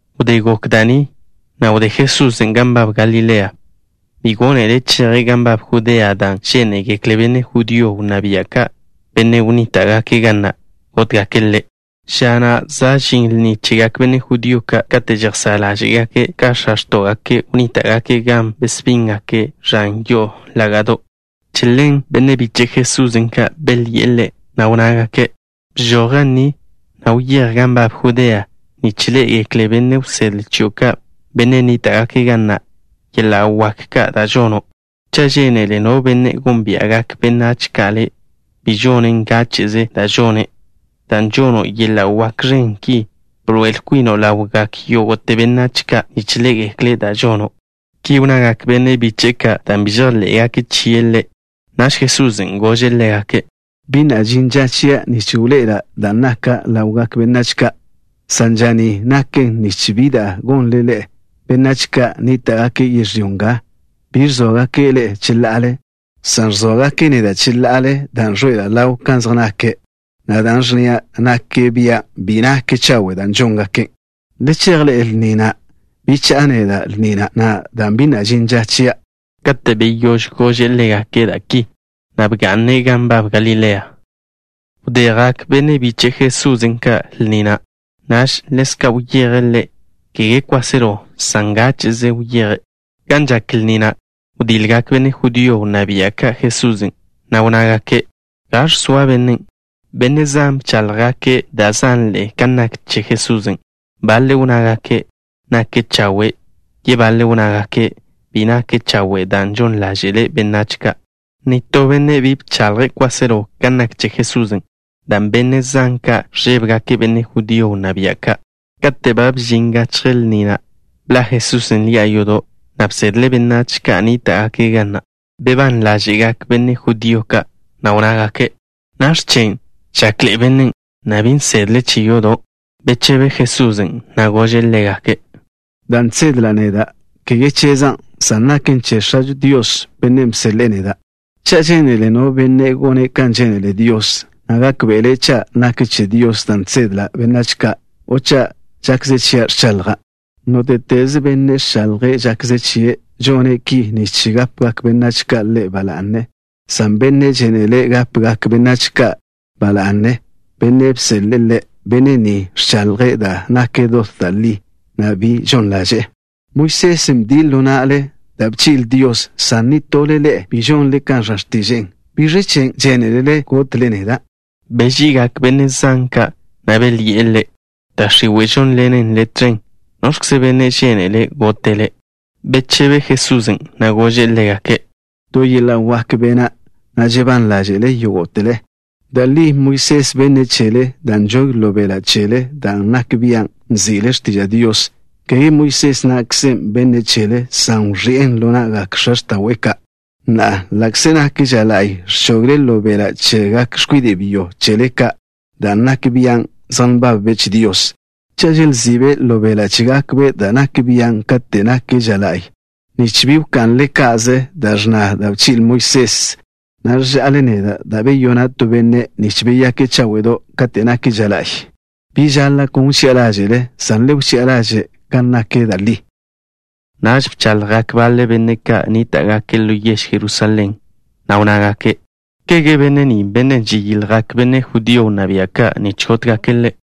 Wdé gok da' ni, wdé Jesusen' gan nbab Galilea. Bi gónele' cheje' gan nbab Judea dan' žénegekle benne' judío wnná bia' ka', benne' nníta'gake' ga na', gótgake' Ḻe'. Ža na' za' žin lni chegak benne' judío ka' kate' žejsá' ḻáže'gake' ka x̱a wdé chégake' wnníta'gake' gan besbíngake' ẕan yo'o lága'do'. Che ḻen benne' biche' Jesusen' ka' belyi'e Ḻe', na' wnnágake': —Bžoj ga ni, na' wyéj gan nbab Judea nich ḻé'egekle benne' wsedle chio' ka', benne' nníta'gake' ga na', yeḻa' wak ka' da' žono'. Cha' žénele no benne' gónbia'gak benách ka' ḻe', bi žone' ngáche'ze da' žone'. Dan' žono' yeḻa' wak ẕen ki, bḻoe'el kwino' ḻawgak yógo'te benách ka' nich ḻé'egekle' da' žono'. Ki wnnagak benne' biche'e ka' dan' bi na' chejḻé'gake' chie' Ḻe'. Naž Jesusen' gože' ḻégake': —Bi na' žin ža chia' nich wḻoe'ela' dan' naka' ḻawgak benách ka', san ža ni naken nich bi da' gonle ḻe'e. Benách ka' nníta'gake' yežlyó nga bi ẕzóagake' ḻe'e cheḻa'ale, san ẕzóagake' neda' cheḻa'ale dan' ẕḻoe'ela' ḻaw kan zej nake', na' da' ẕnnia' nak bian' bi nak chawe' da' žóngake'. Le chej ḻe'e lni na'. Bi cha'a neda' lni na' na'a dan' bi na' žin ža chia'. Kate' beyóž gože' ḻégake' da' ki, bga'ne' gan nbab Galilea. Wdé jak benne' biche' Jesusen' ka' lni na', ḻezka' wyeje' Ḻe', kege kwáselo, san ngáche'ze wyeje'. Gan žak lni na', wdiljgak benne' judío wnná bia' ka' Jesusen', na' wnnágake': —¿Gaẕ zoa bennen'? Benne' zan bcháḻjgake' da' zanḻe'e kan nak che Jesusen'. Baḻe' wnnágake': —Nake' chawe'. Yebaḻe' wnnágake': —Bi nake' chawe' dan' žon ḻáže'le' benách ka'. Nitó benne' bi bchaḻje' kwáselo kan nak che Jesusen', dan' benne' zan ka' ẕžébegake' benne' judío wnná bia' ka'. Kate' ba bžin gachje lni na', bḻa' Jesusen' ḻi'a yodo', na' bsedle' benách ka' nníta'gake' ga na'. Bebán ḻáže'gak benne' judío ka', na' wnnágake': —¿Nakx̱ chen', žakḻe'e bennen', na' bi nsedle' che yodo'? Bechebe Jesusen', na' gože' ḻégake': —Da' žsedla' neda', kege chezan', san naken che X̱ažo Dios, Bennen' bseḻe'e neda'. Cha' žénele no benne' gone' kan žénele Dios, na' gákbe'le' cha' nak che Dios da' žsedla' benách ka' o cha' žakze chia' ẕchaḻja'. Nóte'teze benne' ẕchaḻje' žakze chie', žone' ki nich gápegak benách ka' ḻe' ba la'ne, san bennen' žénele' gápegak benách ka' ba la'ne bennen' bseḻe'e ḻe', benne' ni ẕchaḻje' da' naken dot da' li, na' bi žon ḻaže'e. ’Moisés bdie' ḻo na'le da' bchi'le Dios, san nitole ḻe'e bi žonle kan ẕnna x̱tiže'e. ¿Biẕ chen' žénelele gotle neda'? Beži'igak benne' zan ka', na' belyi'e Ḻe': —Da' x̱iwe' žónḻenen le' tẕen. ¿Noẕkze benne' žénele' gote' le'? Bechebe Jesusen', na' gože' ḻégake': —To yeḻa' wak bena', na' žebán ḻáže'le yógo'tele. Da' li Moisés benne' chele dan' nžogen ḻo beḻa' chele dan' nak bian' nzi'le x̱tiža' Dios. Kege Moisés na'kze bennen' chele, san wẕi'en ḻo na'gak x̱a x̱ta'we' ka'. Na'a, ḻa'kze nak ža la'y, ẕchogle ḻo beḻa' chegak x̱kwide' byo chele ka' dan' nak bian' zej nbabbe' che Dios. Cha' želzi'be' ḻo beḻa' chégakbe' dan' nak bian' kate' nak ža la'y, nich bi wka'nle ca'ze da' ẕnna da' bchi'le Moisés, ¿ẕža'le neda' dan' beyona' to benne', nich beyake' cháwe'do' kate' nak ža la'y? Bi žaḻa' kon wchi'a ḻáže'le, san le wchi'a ḻaže' kan nak da' li. Naž bchaḻjgak baḻe benne' ka' nníta'gake' ḻo yež Jerusalén, na' wnnágake': —¿Kege benne' ni bennen' žeyiljgak benne' judío wnná bia' ka' nich gótgake' Ḻe'?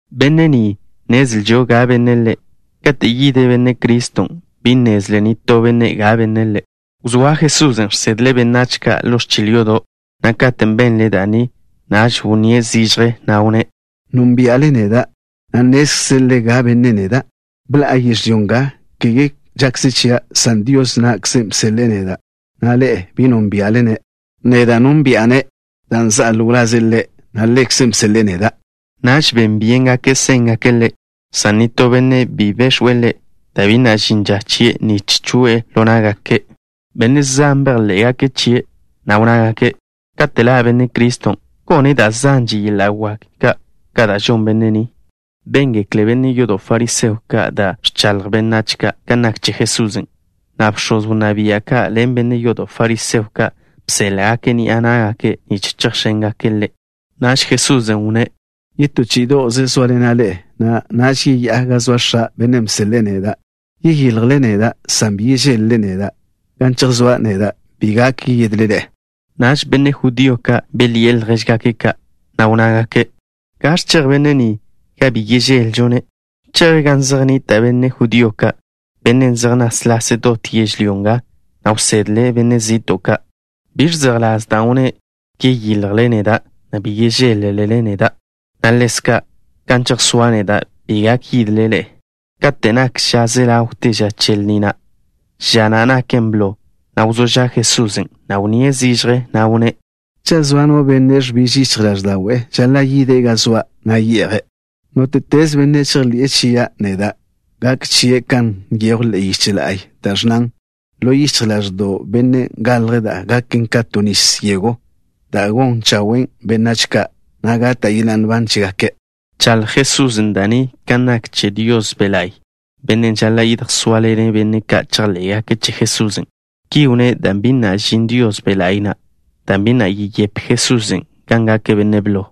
Benne' ni, nnezlžo ga benne' Ḻe'. Kate' yid Benne' Criston', bi nnezle nitó benne' ga benne' Ḻe'. Wzóa Jesusen' ẕsedle' benách ka' ḻo ẕchil yodo', na' katen' benle' da' ni, wnníe' zižje, na' wnné': —¿Nónbia'le neda', na' nnézlele ga benne' neda'? Bḻa'a yežlyó nga, kege žakze chia', san Dios na'kze bseḻe'e neda', na' Ḻe', bi nónbia'le-ne'. Neda' nónbi'a-ne', dan' za'a ḻo wlaze' Ḻe', na' Ḻekze' bseḻe'e neda'. Naž ben byéngake' séngake' Ḻe', san nitó benne' bi bex̱we' Ḻe', dan' bi na' žin ža chie' nich choe'e ḻo ná'gake'. Benne' zan bejḻé'gake' chie', na' wnnágake': —Kate' ḻa' Benne' Criston', ¿gone' da' zanže yeḻa' wak ka' ka da' žon Benne' ni? Béngekle benne' yodo' fariseo ka' da' ẕchaḻjgak benách ka' kan nak che Jesusen', na' bx̱oz wnná bia' ka' ḻen benne' yodo' fariseo ka', bséḻa'gake' ni'a ná'gake' nich chejx̱éngake' Ḻe'. Naž Jesusen' wnné': —Yetó chí'ido'ze sóaḻena' ḻe'e, na' naž yeyá'a gan zoa X̱a', Bennen' bseḻe'e neda'. Yeyiljle neda', san bi yežéḻ-lele neda'. Gan chejsóa' neda' bi gak yidle ḻe'e. Naž benne' judío ka' belyi'e ljéžgake' ka', na' wnnágake': —¿Gaẕ chej benne' ni, gan bi yežéḻ-lžo-ne'? ¿Cheje' gan zej nnita' benne' judío ka', benne' zej náslase' dot yežlyó nga, na' wsedle' benne' zi'to' ka'? ¿Biẕ zejḻás dan' wnné': “Yeyiljle neda', na' bi yežéḻ-lele neda'” na' ḻezka': “Gan chejsóa' neda' bi gak yidle ḻe'e”? Kate' nak ža ze ḻawte ža che lni na', ža na' naken blo, wzó ža' Jesusen'. Wnníe' zižje, na' wnné': —Cha' zoa no benne' ẕbiž yichj ḻáẕda'we', žaḻa' yide' gan zoa', na' ye'je'. Nóte'teze benne' žejḻi'e chia' neda', gak chie' kan nyejw ḻe'e yiche la'y, da' ẕnnan: “Ḻo yichj ḻáẕdo'w bennen' galj da' gaken ka to nis yego” dan' gon chawen' benách ka', na' gata' yeḻa' nban chégake'. Bchaḻj Jesusen' da' ni kan nak che Dios Be' La'y, Bennen' žaḻa' yedjsóaḻene' benne' ka' chejḻé'gake' che Jesusen'. Ki wnné' dan' bi na' žin Dios Be' La'y na', dan' bi na' yeyepe Jesusen' gan gake' Benne' blo.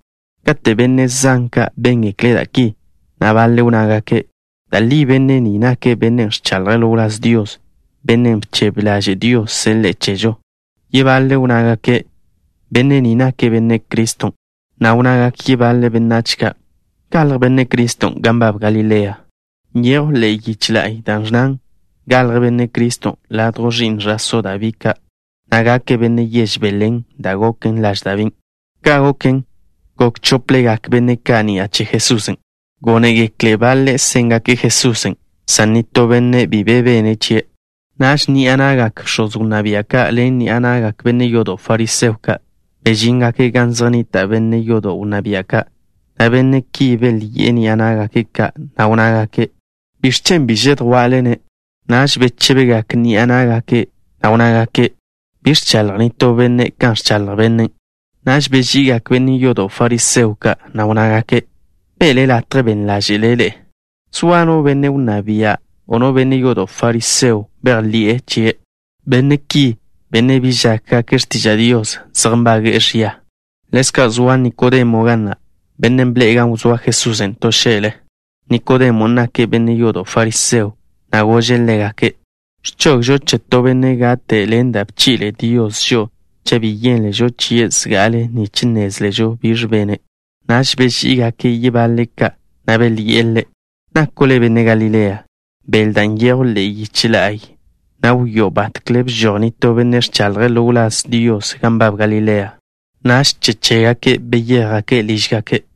Kate' benne' zan ka' béngekle' da' ki, baḻe' wnnágake': —Da' li benne' ni nake' bennen' ẕchaḻje' ḻo wláz Dios, bennen' bchebe ḻaže' Dios seḻe'e chežo. Yebaḻe' wnnágake': —Benne' ni nake' Benne' Criston'. Wnnagak yebaḻe benách ka': —¿Galj Benne' Criston' gan nbab Galilea? Nyejw ḻe'e yiche la'y da' ẕnnan: “Galj Benne' Criston' ladjw ẕi'n ẕa'só Dabí ka', na' gake' benne' yež Belén, da' goken laž Dabín'.” Ka' goken, gok chóplegak benne' ka' ni'a che Jesusen'. Gónegekle' baḻe' séngake' Jesusen', san nitó benne' bi be bene' chie'. Naž ni'a na'gak bx̱oz wnná bia' ka' ḻen ni'a na'gak benne' yodo' fariseo ka', bežíngake' gan zej nnita' benne' yodo' wnná bia' ka', na' benne' ki belyi'e ni'a ná'gake' ka', na' wnnágake': —¿Biẕ chen' bi žedjwa'le-ne'? Naž bechébegak ni'a ná'gake', na' wnnágake': —Bi ẕchaḻj nitó benne' kan ẕchaḻj bennen'. Naž beži'igak benne' yodo' fariseo ka', na' wnnágake': —¿Be'le latje ben ḻáže'le' ḻe'e? ¿Zoa no benne' wnná bia', o no benne' yodo' fariseo, bejḻi'e chie'? Benne' ki, benne' bi žákgake' x̱tiža' Dios, zej nbage'e ẕia. Ḻezka' zoa Nikodemo ga na', bennen' bḻe'e gan wzóa Jesusen' to xe'le. Nikodemon' nake' benne' yodo' fariseo, na' gože' ḻégake': —¿Ẕchogžo che to benne' gate' ni'a che da' bchi'le Dios žo'o cha' bi yénležo chie' zga'ale nich nnézležo biẕ bene'? Naž beží'igake' yebaḻe' ka', na' belyi'e ḻe': —¿Nako' le' benne' Galilea? Beḻ da' nyejw ḻe'e yich la'y, na' wio' batkle bžoj nitó benne' ẕchaḻje' ḻo wláz Dios gan nbab Galilea. Naž che chégake' beyéjgake' lížgake'.